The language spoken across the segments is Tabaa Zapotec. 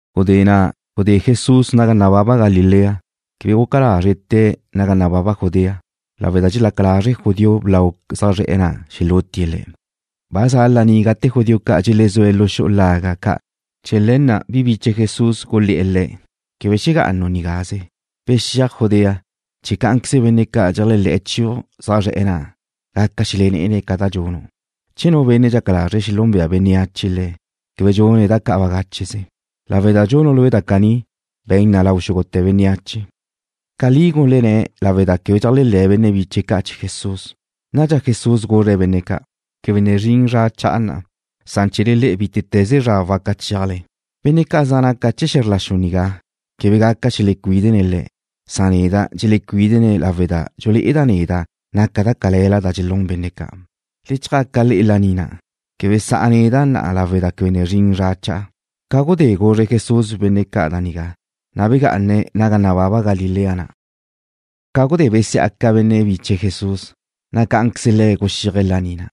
Gudé na' gudé Jesús naga nababa Galilea. Quebe guca lazre̱' tee̱' naga nababa Judea lawe' da dxelaca lazre' judío blau zaj zre̱'e̱ na' xelútie̱' Le̱'. Ba za laní gate judío ca' dxelezúe̱' lu xu'u laga' ca'. Chee̱ le̱ na' bi biche Jesús gulé̱'e̱ Le̱': ―Quebe xegá'anu' nigáze. Bexíaj Judea, chee̱ cá'anqueze benne' ca' dxeléajle̱ chiu' zaj zre̱'e̱ na' gaca xelelé'ene̱' ca da dxunu'. Che nu benne' dxaca lazre̱' xelúnbe'e bénneache le̱', quebe dxune̱' da ca' bagácheze. Lawe' da dxunu' Lue' da caní, be̱n na lau xúgute̱ bénneache. Caní gulenné̱' lawe' da quebe dxeléajle̱ benne' biche̱' ca' chee̱ Jesús. Nadxa Jesús guzre̱' benne' ca': ―Quebe ne zrin zra cha'a na'. Chee̱le le'e bítete̱ze zra waca chéajle. Benne' ca' zaj naca chee̱ xe̱zr la xu nigá quebe gaca xelecuídene̱' le'e. Dxelecuídene̱' neda' lawe' da dxulé'eda' neda' naca da cale̱la da dxelún benne' ca'. Le chjaca le'e laní na'. Quebe sa'a neda' na'a lawe' da quebe ne zrin zra cha'a. Ca gudé guzre Jesús benne' ca' da nigá, na' begá'ane̱' naga nababa Galilea na'. Ca gudé besiá'aca benne' biche Jesús, na' cá'anqueze Le̱' guxíaje̱' laní na'.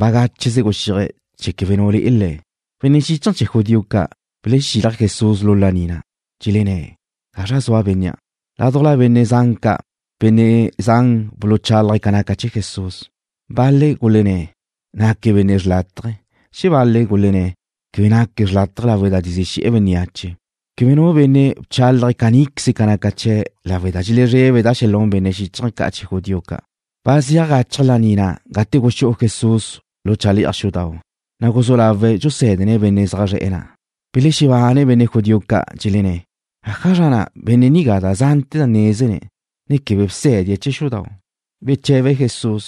Bagácheze guxíaje̱' chee̱ quebe nu le'e Le̱'. Benne' xíchaje̱ chee̱ judío ca' belexílaje̱' Jesús lu laní na'. Dxelenné̱': ―¿Gazra zua bénnea'? Ládujla benne' zan ca', benne' zan buluchálaje̱' ca naca chee̱ Jesús. Bal-le̱' gulenné̱': “Naque̱' benne' xrlátaje.” Xebal-le̱' gulenné̱': “Quebe naque̱' xrlátaje lawe' da dxezí xe̱'e̱ bénneache.” Quebe nu benne' bchálaje̱' caníqueze ca naca chee̱' lawe' da dxelezrebe̱' da xelún benne' xíchaje̱ ca' chee̱ judío ca'. Ba zeaj gachaj laní na' gate guxú'u Jesús lu chale'aj xudau', na' guzú lawe̱' dxusé̱dene̱' benne' zaj zre̱'e̱ na'. Belexebane benne' judío ca', dxelenné̱': ―¿Ájazra na' benne' nigá da zante̱ nézene̱', ne quebe bsé̱die̱' chee̱ xudau'? Beche̱be Jesús: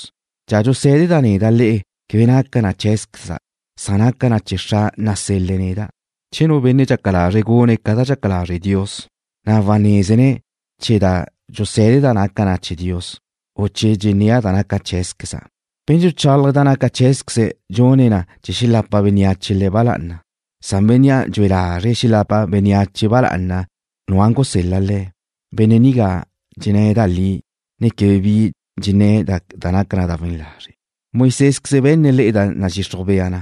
―Da dxusé̱deda' neda' le'e quebe naca na cheé̱zqueza'. Naca na chee̱ Xra' nasel-le̱' neda'. Che nu benne' dxaca lazre̱' gune̱' ca da dxaca lazre' Dios, na' wanézene̱' che da dxusé̱deda' naca na chee̱ Dios, u che dxennéa' ca da naca cheé̱zqueza'. Benne' dxuchálaje̱' da naca cheé̱zqueze̱' dxune̱' na chee̱ xelapa bénneache le̱' ba lá'ana. Bénnea' dxue lazre̱' xelapa bénneache ba lá'ana bénnea' gusel-le̱' le̱', benne' nigá dxenné̱' da li, ne quebe bi dxenné̱' da naca na da we̱n lazre'. ’Moisésqueze be̱nne̱' le'e da nadxixruj bea na,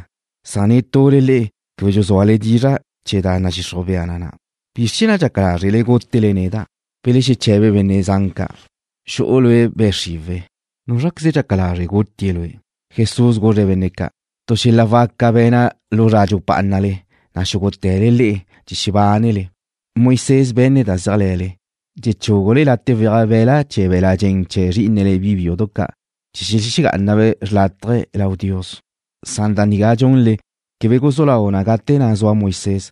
na' netule le'e quebe dxuzúale dizra' chee̱ da nadxixruj bea na na'. ¿Bizr chee̱ na' dxaca lázrele gútele neda'? Belexeche̱be benne' zan ca': ―Xu'u lue' be' xriwe̱'. ¿Núzraqueze dxaca lazre' gutie̱' lue'? Jesús guzre̱' benne' ca': ―Tu xel-la' waca be̱na' lu zra dxupá'anale, na' xúgute̱le le'e dxebánele. Moisés be̱nne̱' da zéajle̱le, dxechúgule late' weaj be̱la' chee̱ be̱l-la' dxen chee̱ zrí'inele bi biudu ca' chee̱ xelexegá'anabe' xrlátaje lau Dios. Da nigá da dxunle quebe guzú lau na gate na' zua Moisés.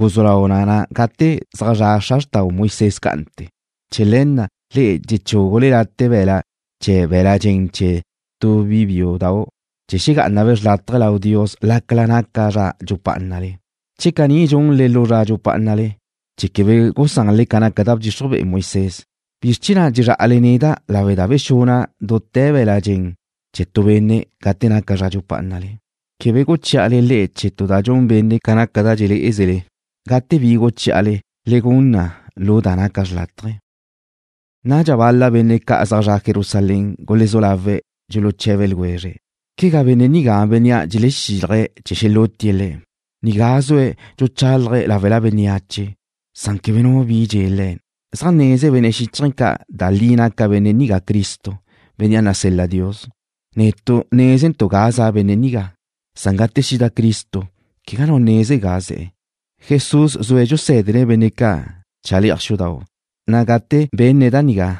Guzú lau na gate zaj zra' xra xrtau Moisés cá'ante̱. Chee̱ le̱ na' le'e dxechúgule late' be̱la' chee̱ be̱l-la' dxen chee̱ tu bi biúdau' chee̱ xegá'anabe' xrlátaje lau Dios lácala naca zra dxupá'anale. Che caní dxunle lu zra dxupá'anale chee̱ quebe gusanle ca naca da bdxixruj be'e Moisés, ¿bizr chee̱ na' dxezrá'ale neda' lawe' da bexuna' dute̱ be̱l-la' dxen chee̱ tu benne' gate naca zra dxupá'anale? Quebe guchí'ale le'e chee̱ tu da dxun benne' ca naca da dxelé'ezele. Gate bi da guchí'ale, le gun na lu da naca xrlátaje. Nadxa bal-la benne' ca' zaj zre̱'e̱ Jerusalén gulezú lawe̱' dxuluche̱be ljwezre̱': ―¿Quegá benne' nigá bénnea' dxelexílaje̱' chee̱ xelútie̱' le̱'? Nigá zue̱' dxuchálaje̱' láwela bénneache, na' quebe nu bi dxe̱ Le̱'. ¿Zaj neze benne' xíchaje̱ ca' da li naca benne' nigá Cristo, Bénnea' nasel-la Dios? Netu' nézentu' ga za' benne' nigá. Gate xida Cristo, quegá nu neze ga ze̱'e̱. Jesús zue̱' dxusé̱dene̱' benne' ca' chale'aj xudau', na' gate benne̱' da nigá,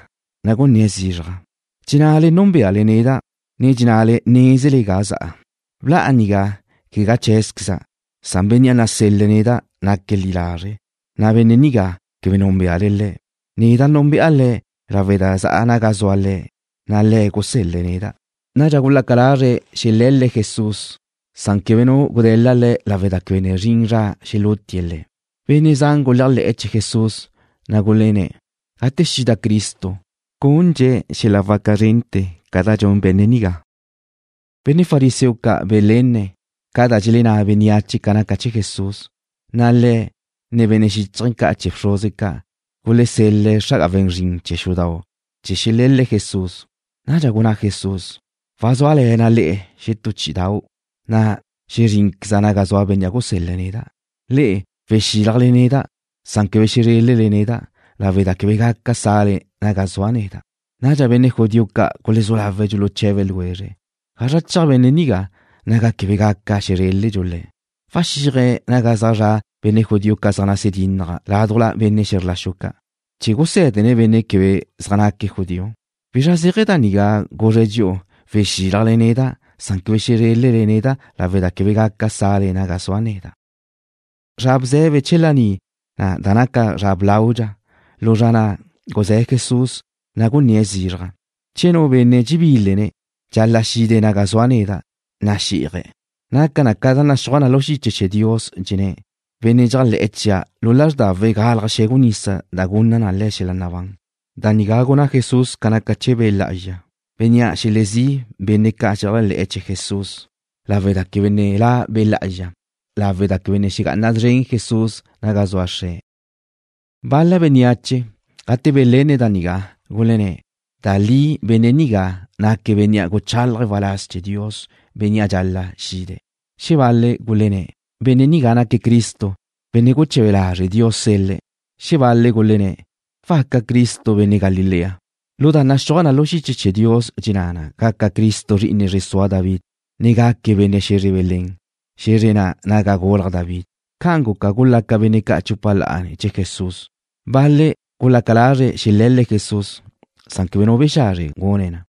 na' gunné̱' zizraj: ―Dxennale núnbeale neda', ne dxennale nézele ga za'a. Bla'a nigá, quegá cheé̱zqueza'. Bénnea' nasel-le̱' neda' naque̱' li lazre', na' Bénnea' quebe núnbeale le'e. Neda' núnbe'a Le̱' lawe' da za'a naga zua Le̱', na' Le̱' gusél-le̱' neda'. Nadxa gulaca lazre̱' xele̱l-le̱' Jesús. Quebe nu gude̱la Le̱' lawe' da quebe ne zrin zra chee̱ xelútie̱' Le̱'. Benne' zan guléajle̱'e̱ chee̱ Jesús, na' gulenné̱': ―Gate xida Cristo, ¿gúnljadxe̱' xel-la' waca zrente̱ ca da dxun benne' nigá? Benne' fariseo ca' belenne̱' ca da dxelenná bénneache ca naca chee̱ Jesús, na' le̱', ne benne' xíchaje̱ ca' chee̱ bxruze ca' gulesel-le̱' xra'aga we̱n zrin chee̱ xudau' chee̱ xele̱l-le̱' Jesús. Nadxa gunná Jesús: ―Wazúale̱na' le'e xetú chí'idau', na' xezrínqueza' naga zua Bénnea' gusél-le̱' neda'. Le'e wexílajle neda', na' quebe xezrélele neda', lawe' da quebe gaca sa'le naga sua' neda'. Nadxa benne' judío ca' gulezú lawe̱' dxuluche̱be ljwezre̱': ―¿Gazra cheaj benne' nigá, naga quebe gaca xezreldxu Le̱'? ¿Waxíaje̱' naga zaj zra' benne' judío ca' zaj nase dínnaje̱' ládujla benne' xe̱zr la xu ca' chee̱ gusé̱dene̱' benne' quebe zaj naque̱' judío? ¿Bizra zéaje̱ da nigá guzre̱' dxi'u: Wexílajle neda', na' quebe xezrélele neda' lawe' da quebe gaca sa'le naga sua' neda'? Zra bze̱be chee̱ laní na' naca na zra blaudxa. Lu zra na' guzé̱ Jesús, na' gunné̱' zizraj: ―Che nu benne' dxebílene̱', dxal-la' xide̱' naga zua' neda', na' xí'aje̱'. Naca na ca naxúaj na lu xiche chee̱ Dios, dxenné̱': “Benne' dxéajle̱'e̱ chia', lu lázrdawe̱' galaj xe̱gu nisa da gunna na xel-la' nabán.” Da nigá gunná Jesús ca naca chee̱ Be' Lá'azxa, Bénnea' xelezí' benne' ca' xeléajle̱'e̱ chee̱ Jesús, lawe' da quebe ne la' Be' Lá'azxa lawe' da quebe ne xegá'ana szren Jesús naga zua Xre̱'. Bal-la bénneache, gate belenne̱' da nigá, gulenné̱': ―Da li benne' nigá naque̱' Bénnea' guchalaje̱' waláz chee̱ Dios, Bénnea' dxal-la' xide̱'. Xebal-le̱' gulenné̱': ―Benne' nigá naque̱' Cristo, Benne' guche̱be lazre' Dios sel-le̱'. Xebal-le̱' gulenné̱': ―¿Waca Cristo benne' Galilea? Lu da naxúaj na lu xiche chee̱ Dios dxenná na gaca Cristo zri'ine zre sua David, ne gaque̱' benne' xe̱zre Belén, xe̱zre na' naga gulaj David. Ca'an guca, gulaca benne' ca' chupa la'a ne̱ chee̱ Jesús. Bal-le̱' gulaca lazre̱' xele̱l-le̱' Jesús, na' quebe nu bexazre gune̱' na.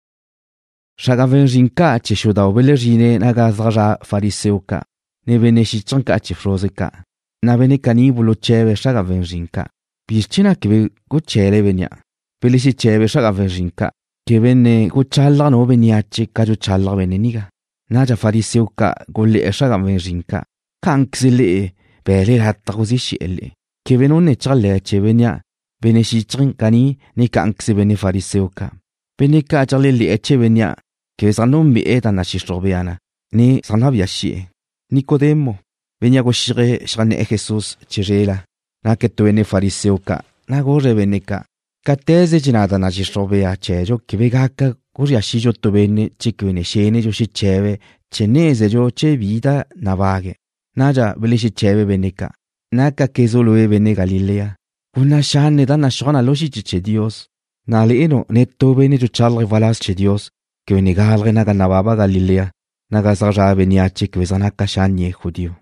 Xra'aga we̱n zrin ca' chee̱ xudau' belexezrine̱' naga zaj zra' fariseo ca', ne benne' xíchaje̱ ca' chee̱ bxruze ca', na' benne' caní buluche̱be̱' xra'aga we̱n zrin ca': ―¿Bizr chee̱ na' quebe guche̱le bénnea'? Belexeche̱be xra'aga we̱n zrin ca': ―Quebe ne guchalaj nu bénneache ca dxuchalaj benne' nigá. Nadxa fariseo ca' gulé̱'e̱ xra'aga we̱n zrin ca': ―¿Cá'anqueze le'e be̱le lataj guzí xe̱'e̱ le'e? Quebe nu ne chéajle̱ chee̱ bénnea', benne' xíchaje̱ caní, ne cá'anqueze benne' fariseo ca'. Benne' ca' dxeléajle̱'e̱ chee̱ bénnea' quebe zaj núnbe'e̱ da nadxixruj bea na, ne zaj nabía xi'e̱. Nicodemo, bénnea' guxíaje̱' xeajnné̱'e̱ Jesús chizrela naque̱' tu benne' fariseo ca', na' guzre̱' benne' ca': ―Cate̱ze dxenná da nadxixruj bea chee̱dxu quebe gaca guzría xidxu tu benne' che quebe ne xénedxu xeche̱be̱' chee̱ nézedxu che bi da nabague̱'e̱. Nadxa belexeche̱be benne' ca': ―¿Nácaquezu' lue' benne' Galilea? Gunná' xanne' da naxúaj na lu xiche chee̱ Dios, na' le'enu' netú benne' dxuchalaje̱' waláz chee̱ Dios quebe ne gálaje̱' naga nababa Galilea, naga zaj zra' bénneache quebe zaj naca xánnie̱' judío.